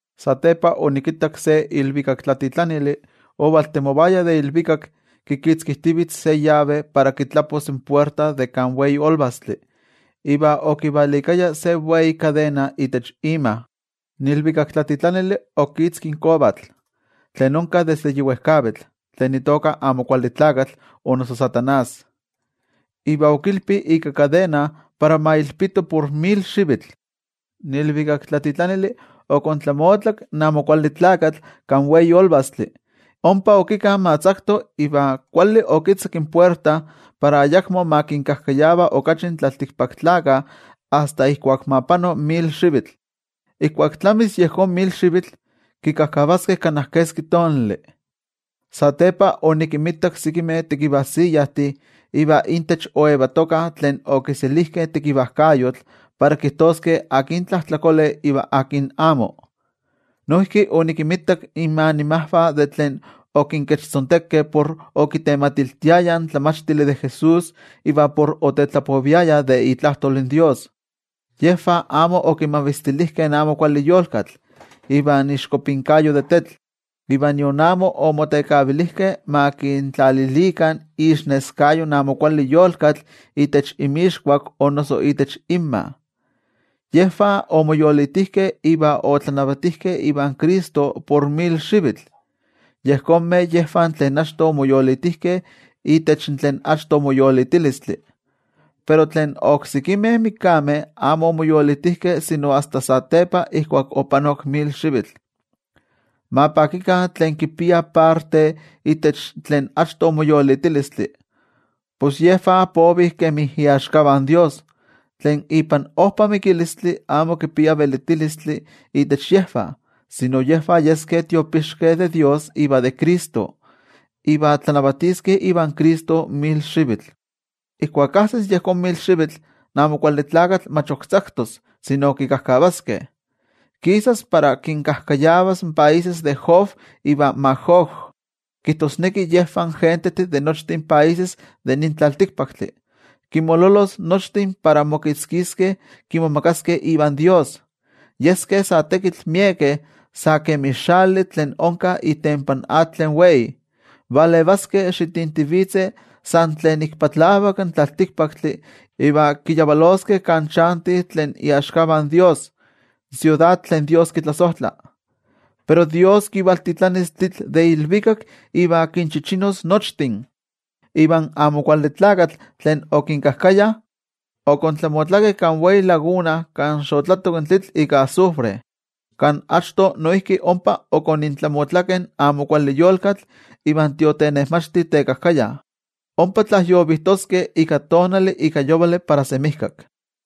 Satepa onikittak se ilvikaktlatitlanili ovaltemovaya de ilvikak kitzkijtivitz se yave para kitlapos in puerta de kan wei olvastli iva okivalikaya se wei kadena itech ima. In ilvikaktlatitlanili okitzki in kovatl, tlen onka desde yi wejkavitl, tlen noijki itoka Amo Kuali Tlakatl o noso Satanás, iva okilpi ika kadena para ma ilpito por mil xivitl. In ilvikaktlatitlanili okontlamotlak in Amo Kuali Tlakatl kan wei olvastli, ompa okika ma tzakto iva kuali okitzaki in puerta para ayakmo ma kinkajkayava okachi in tlaltikpaktlakah asta ijkuak ma pano mil xivitl. Ijkuak tlamis yejón mil xivitl, kikajkavaskeh kana keski tonali. Satepa onikinmitak sekimeh tekivajsiyajtih iva intech oyetokah tlen okiselijkeh tekivajkayotl para kijtoskeh akin tlajtlakole iva akin amo. Noijki onikinmitak inmanimajvah tlen okinkechtzontekeh por okitematiltiayah in tlamachtili de Jesús iva por otetlapoviayah de itlajtol in toYejwatzi. Yejvah amo okimavistilijkeh in amo kuali yolkatl ivan iixkopinkayo de tetl, iva nion amo omotekavilijkeh ma kintlalilikah iixneskayo in amo kuali yolkatl itech inmixkuak o noso itech inmah. Yejvah omoyolitijkeh iva otlanavatijkeh ivan Cristo por mil xivitl. Yejonmeh yejvah tlen achto omoyolitijkeh itech tlen achto moyolitilistli. Pero tlen oksekimeh mikameh amo omoyolitijkeh sino asta satepa ijkuak opanok mil xivitl. Ma pakikah tlen kipiah parte itech tlen achto moyolitilistli, pos yejvah povih kemi iaxkavah in toYejwatzi. Tlen ipan ojpa mikilistli amo kipia velitilistli itech yejvah, sino yejvah yeskeh tiopixkeh de toYejwatzi iva de Cristo. Iva tlanavatiskeh ivan Cristo mil xivitl. Ijkuak ajsis yejón mil xivitl, in Amo Kuali Tlakatl mach ok tzaktos, sino kikajkavaskeh. Kisas para kinkajkayavas in países de Gog iva Magog, kijtosneki yejvah in gentejtih de nochtin países de nin tlaltikpaktli. Kinmololos nochtin para mokitzkiskeh kimomagaskeh ivan toYejwatzi. Yeskeh sa tekitl miekeh sa kemi xali tlen onka itempan atl tlen wei. Valevaskeh xitintivitzeh san tlen ik patlavak in tlaltikpaktli, iva kiyavaloskeh kan chantih tlen iaxkavah in toYejwatzi, in siudad tlen toYejwatzi kitlasojtla. Pero toYejwatzi kivaltitlanis tlitl de ilvikak iva kinchichinos nochtin. Iva in Amo Kuali Tlakatl, tlen okinkajkaya, okontlamotlakeh kan wei laguna kan xotlatok in tlitl ika azufre, kan achto noijki ompa okonintlamotlakeh in amo kuali yolkatl iva in tiotenejmachti tekajkaya. Ompa tlajyovijtoskeh ika tonali ika yovali para semijkak.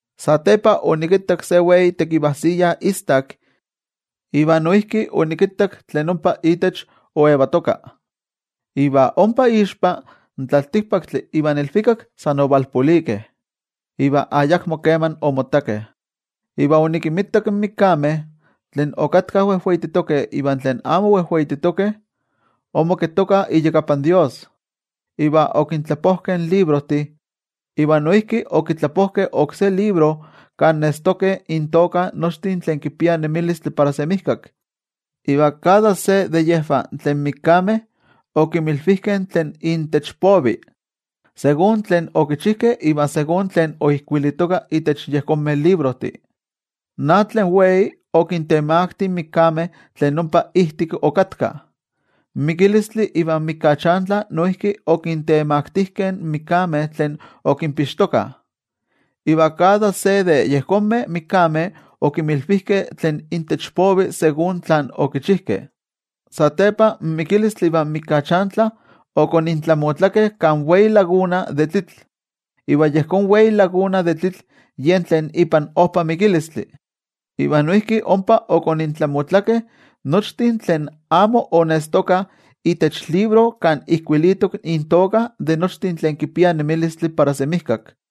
Satepa onikittak se wei tekivajsiya istak, iva noijki onikittak tlen ompa itech oyetoka. Iva ompa ixpa, in tlaltikpaktli ivan ilvikak san ovalpolikeh, iva ayakmo keman omottakeh. Iva onikinmitak in mikameh, tlen okatkah wejweititokeh iva tlen amo wejweititokeh, omoketokah iyakapan toYejwatzi. Iva okintlapojkeh in librojtih. Iva noijki okitlapojkeh oksé libro, kan nestokeh intoka nochtin tlen kipiah nemilistli para semijkak. Iva kada se de yejvah tlen mikameh okinmilvijkeh tlen intech povi, ijkó kemi tlen okichijkeh iva ijkó kemi tlen oijkuilitoka itech yejonmeh librojtih. In atl tlen wei okintemakti in mikameh tlen ompa ijtik okatkah. In Mikilistli ivan Mikachantli noijki okintemaktijkeh in mikameh tlen okinpixtokah. Iva kada se de yejonmeh mikameh okinmilvijkeh tlen intech povi ijkó kemi tlen okichijkeh. Satepa in Mikilistli ivan Mikachantli okonintlamotlakeh kan wei laguna de tlitl. Iva yejón wei laguna de tlitl yen tlen ipan ojpa mikilistli. Iva noijki ompa okonintlamotlakeh nochtin tlen amo onestokah itech libro kan ijkuilitok intoka de nochtin tlen kipiah nemilistli para semijkak.